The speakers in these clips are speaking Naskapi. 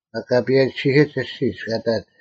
ᒪᒃ ᑲᐸᔭᒋᓯᓯᒡ ᐊᔅᒋᒡ ᑲ ᑕᒡ,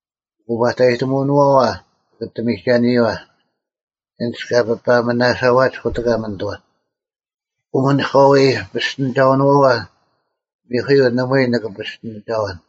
ᐅᑯᐸᑕᔨᑎᒧᐅᓄᐛᐛ ᒋᑭ ᐊᑎ ᒥᒐᓂᔪᐛ ᐊᓐᒡ ᑲ ᐱᐸᒥᓇᓴᐛᒡ ᑯᑎᑲ ᒥᓂᑐᐛ: ᐅᒥᓂᒂᐎ ᐱᔅᑎᓂᒐᐅᓄᐛᐛ ᒥᐧᑯᔪᐤ ᓇᒪᐎᔭ ᓂᑭ ᐱᔅᑎᓂᒐᐛᓐ,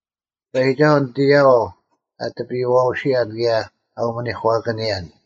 ᑎᐸᔨᒋᒐᓱᐤ ᓂᑦ ᐊᔭᐛᐤ ᐊ ᑎᐱᔨᐛᐅᓯᔭᓐ ᑭᔭ ᐊ ᐅᒥᓂᒂᑭᓂᔭᓐ: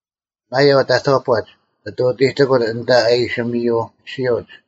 ᒪᔭᐤ ᑕᑥᐸᒡ ᓂᑦ ᐅᑎᑎᑯᓐ ᐊᓐᑕ ᐊ ᐃᓯ ᒥᔪ ᐊᔅᒋᐅᒡ;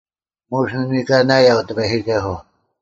ᒧᔅ ᓂ ᓂᑲᓇᔭᐤ ᑎᐸᔨᒋᒐᓱᐤ: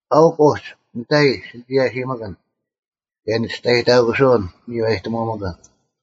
ᐊᐅᒄ ᐅᒡ ᓂᑕᔨᔾ ᓯᒋᔭᓯᒥᑭᓐ, ᑭᔭ ᓂᒋᔅᑕᔨᑕᑯᓱᐅᓐ ᒥᔽᑎᒧᒥᑭᓐ: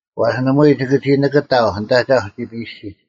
ᐛᔅ ᓇᒪᐎᔾ ᒋᑭ ᓂᑭᑕᐤ ᓂᑦ ᐊᒐᐧᒄ ᒋᐱᔾ ᐊᔅᒋᒡ;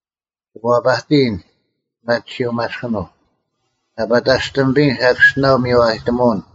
ᒋᑭ ᐛᐸᑎᔨᓐ ᐱᒪᑎᓱᐅ-ᒪᔅᑭᓄᐤ: ᐊ ᐸᑕᔅᑎᒥᐱᔨᓐ ᓴᑭᔅᒋᓇᐤ ᒥᔽᔨᑎᒧᐅᓐ;